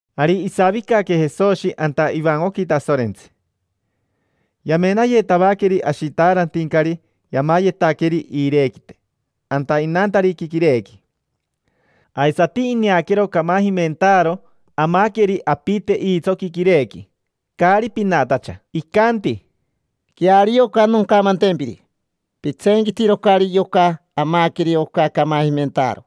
Ari isavicaque Jesoshi anta ivancoqui Tasorentsi. Yamenayetavaqueri ashitaarantincari yamayetaqueri iirequite anta inantariqui quirequi. Aisati ineaquero camajimentaaro amaqueri apite iitsoqui quirequi, caari pinatacha. Icanti: —Queario oca noncamantempiri: pitseenquitirocari yoca amaqueri oca camajimentaaro.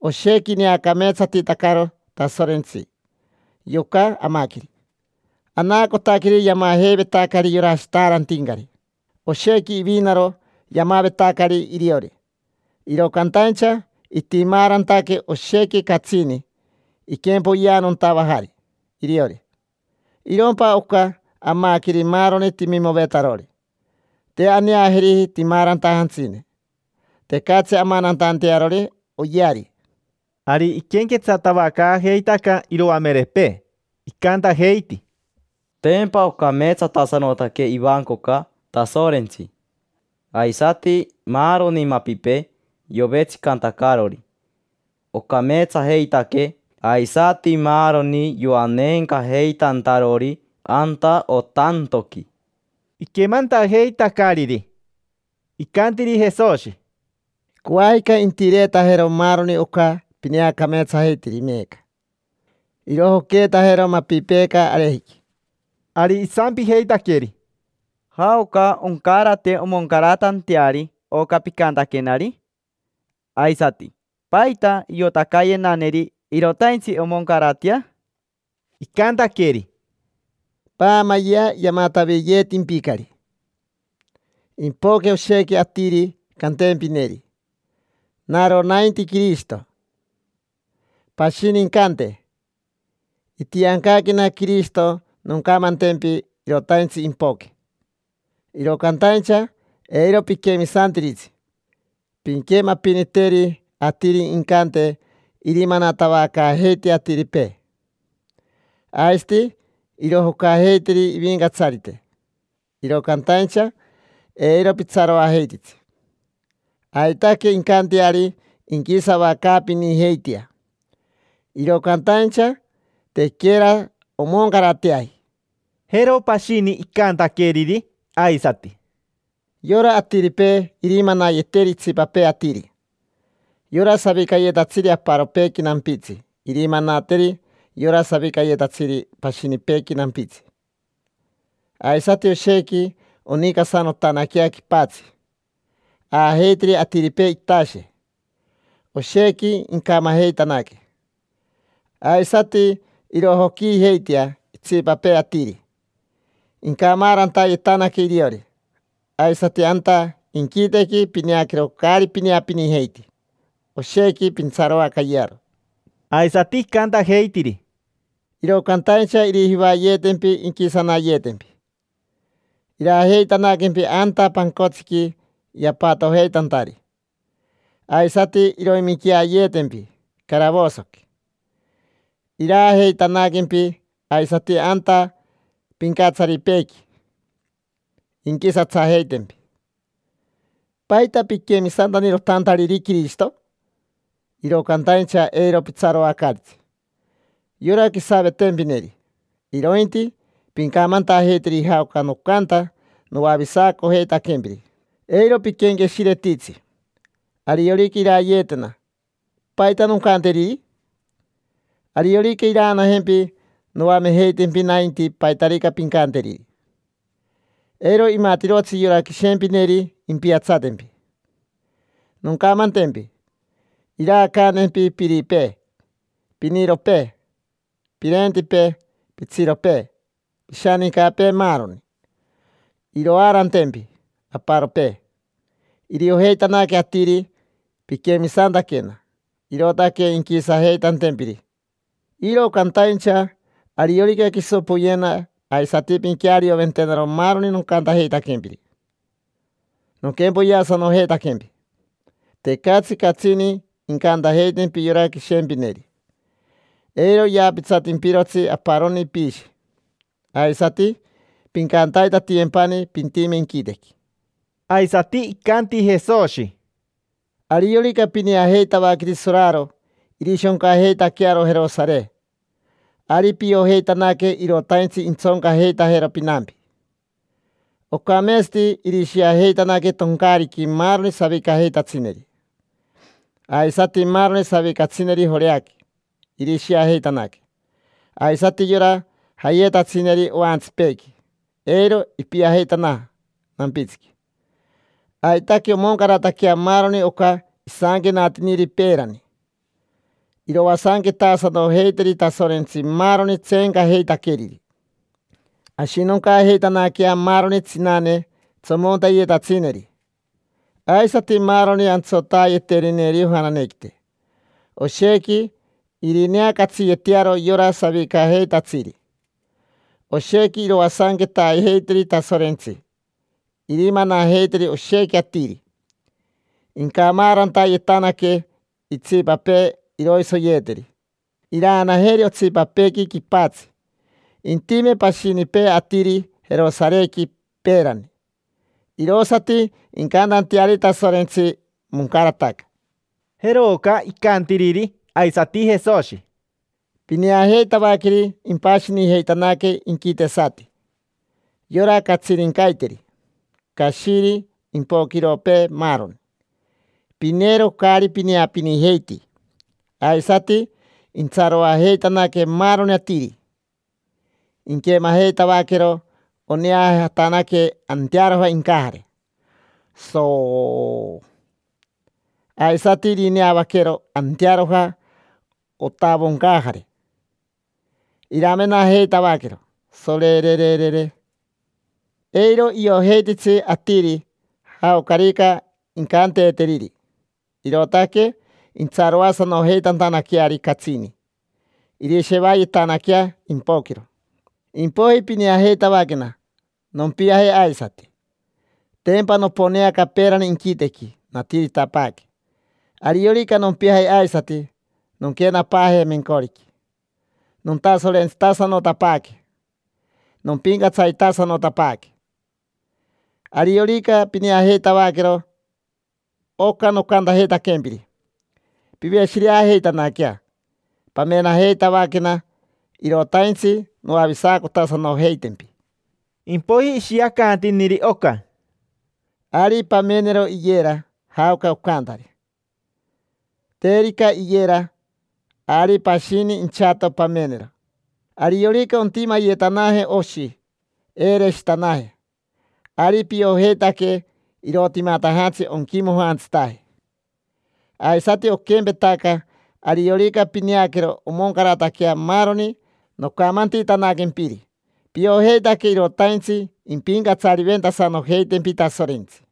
Oshequi ineacameetsatitacaro Tasorentsi yoca amaqueri, anaacotaqueri yamajeivetacari yora ashitaarantincari. Oshequi ivinaro yamavetacari iriori, iro cantaincha itimaarantaque oshequi catsini iquempoyeanontavajari iriori. Irompa oca, amaqueri maaroni timimovetarori, te aneajeriji timaarantajantsine, tecatsi amanantantearori oyeari. Ari iquenquetsatavacaajeitaca iroamerepee, icantajeiti: —Tempa ocameetsatasanotaque ivancoca Tasorentsi. Aisati maaroni mapipee yovetsicantacarori, ocameetsajeitaque, aisati maaroni yoaneencajeitantarori anta otantoqui. Iquemantajeitacariri, icantiri Jesoshi: —Coajica intireetajero maaroni oca pineacameetsajeitiri meeca. Irojoqueetajero mapipeeca arejiqui. Ari isampijeitaqueri: —¿Jaoca oncarate omoncaratanteari oca picantaquenari? Aisati, ¿paita iotacaayenaneri irotaintsi omoncaratea? Icantaqueri: —Paamayea, yamataviyeetimpicari. Impoque oshequi atiri cantempineri: “Naro nainti Quirishito”. Pashini incante: “Itiancaquena Quirishito noncamantempi irotaintsi impoque”. Iro cantaincha eiro piquemisantiritsi. Pinquemapiniteri atiri incante irimanatavacaajeitea atiripee, aisati irojocajeiteri ivincatsarite. Iro cantaincha eiro pitsaroajeititsi. Aitaque incanteari inquisavacaapinijeitea, iro cantaincha tequera omoncarateaji. Jero pashini icantaqueriri aisati: —Yora atiripee irimanayeteri itsipapee atiri. Yora savicayetatsiri aparopeequi nampitsi irimanateri yora savicayetsiri pashinipeequi nampitsi. Aisati oshequi onicasanotanaquea quipatsi. Aajeiteri atiripee itashe, oshequi incamajeitanaque; aisati irojoquiijeitea itsipapee atiri, incamaarantayetanaque iriori. Aisati, anta inquitequi pineaquero caari pineapinijeiti, oshequi pintsaroacayearo. Aisati icantajeitiri: —Iro cantaincha irijivayeetempi inquisanayeetempi. Iraajeitanaquempi anta pancotsiqui yapatojeitantari, aisati iroiminqueayetempi caravosoqui. Iraajeitanaquempi aisati anta pincatsaripeequi, inquisatsajeitempi: “¿Paita piquemisantanirotantariri Quirishito?” Iro cantaincha eiro pitsaroacaaritsi yora quisavetempineri, irointi pincamantajeiteri jaoca nocanta noavisacojeitaquempiri. Eiro piquenqueshiretitsi: “Ariorica irayeetena, ¿paita noncanteriri?” Ariorica iraanajempi noamejeitempi nainti paitarica pincanteriri. Eiro imatirotsi yora quishempineri impiatsatempi. Noncamantempi: iraacantempi piripee, piniropee, pirentipee, pitsiropee, pishanincapee, maaroni. Iroaarantempi aparopee. Iriojeitanaque atiri piquemisantaquena, irootaque inquisajeitantempiri. Iro cantaincha ariorica quiso poyena aisati pinquearioventenaro maaroni nocantajeitaquempiri, nonquempoyeasanojeitaquempi. Tecatsi catsini incantajeitempi yora quishempineri, eiro yaapitsatimpirotsi aparoni piishi. Aisati pincantaitatiyempani pintime inquitequi. Aisati icanti Jesoshi: —Ariorica pineajeitavaqueri soraro irishoncajeitaquearo Jerosare, ari piojeitanaque irotaintsi intsoncajeitajero pinampi. Ocameetsati irishiajeitanaque toncaariqui maaroni savicajeitatsineri. Aisati maaroni savicatsineri Joreaqui, irishiajeitanaque. Aisati yora jayetatsineri oantsipeequi, eiro ipiajeitanaja nampitsiqui. Aitaque omoncarataquea maaroni oca isanquenatiniri peerani: “Iroasanquetaasanojeiteri Tasorentsi maaroni tseencajeitaqueriri”. Ashinoncaajeitanaquea maaroni tsinane tsomonteyetatsineri, aisati maaroni antsotaayeterineri ojananequite. Oshequi irineacatsiyetearo yora savicajeitatsiri. Oshequi iroasanquetaajeiteri Tasorentsi. Irimanajeiteri oshequi atiri, incamaarantayetanaque. Itsipapee iroisoyeteri, iraanajeri otsipapeequi quipatsi. Intime pashinipee atiri Jerosarequi peerani, irosati incantanteari Tasorentsi: “Moncarataca”. Jeroca icantiriri aisati Jesoshi: —Pineajeitavaqueri impashinijeitanaque inquitesati: yora catsirincaiteri, cashiri, impoquiropee, maaroni. Pineero caari pineapinijeiti. Aisati intsaroajeitanaque maaroni atiri, inquemajeitavaquero oneajatanaque antearoja incajare, soooo. Aisati irineavaquero antearoja otavoncajare. Iramenajeitavaquero, sorererere. Eiro iojeititsi atiri jaocarica incanteeteriri, irootaque intsaroasanojeitantanaqueari catsini. Irishevayetanaquea impoquiro. Impoiji pineajeitavaquena, nompiaje aisati. Tempa noponeaca peerani inquitequi, natiritapaaque. Ariorica nompiaje aisati, nonquenapaaje mencoriqui, nontasorentsitasanotapaaque, nompincatsaritasanotapaaque. Ariorica pineajeitavaquero oca nocantajeitaquempiri, piveshireajeitanaquea, pamenajeitavaquena: irotaintsi noavisacotasanojeitempi. Impoiji ishiacantiniri oca: —Ari pamenero iyera, jaoca ocantari. Terica iyera, ari pashini inchato pamenero. Ariorica ontimayetanaje oshi, eereshitanaje, ari piojeitaque irootimatajantsi onquimojantsitaje. Aisati oquempetaca, ariorica pineaquero omoncarataquea maaroni nocamantitanaquempiri, piojeitaque irotaintsi impincatsariventasanojeitempi Tasorentsi.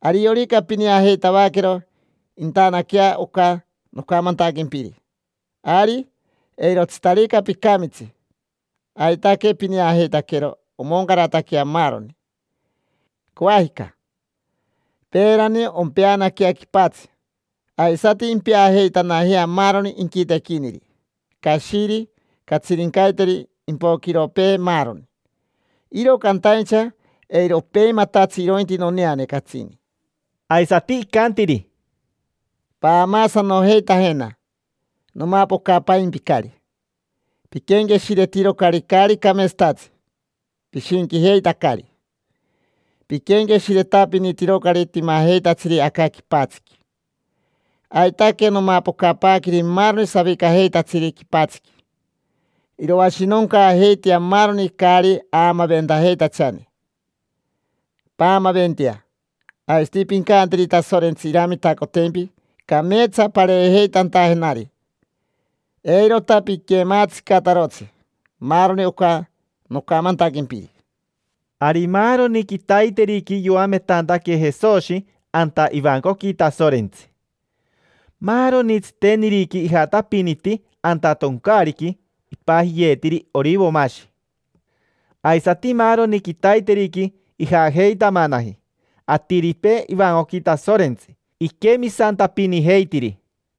Ariorica pineajeitavaquero intanaquea oca nocamantaquempiri, ari eirotsitarica picamitsi, aitaque pineajeitaquero omoncarataquea maaroni. Coajica, peerani, ompeanaquea quipatsi aisati impeajeitanajea maaroni inquitequiniri: cashiri, catsirincaiteri, impoquiropee, maaroni. Iro cantaincha eiro opeimatatsi irointi noneane catsini. Aisati icantiri: —Paamaasanojeitajena: nomapocapaimpicari. Piquenqueshiretirocari caari cameetsatatsi. Pishinquijeitacari. Piquenqueshiretapinitirocari timajeitatsiri aca quipatsiqui. Aitaque nomapocapaaqueri maaroni savicajeitatsiri quipatsiqui. Iroashinoncaajeitea maaroni caari aamaventajeitachane. Paamaventea. Aisati pincanteri Tasorentsi iramitacotempi cameetsa pareejeitantajenari, eirota piquematsicatarotsi maaroni oca nocamantaquempiri. Ari maaroni quitaiteriqui yoametantaque Jesoshi anta ivancoqui Tasorentsi. Maaroni tsiteniriqui ijatapiniti anta toncaariqui ipajiyeetiri Orivomashi. Aisati maaroni quitaiteriqui ijajeitamanaji atiripee ivancoqui Tasorentsi iquemisantapinijeitiri.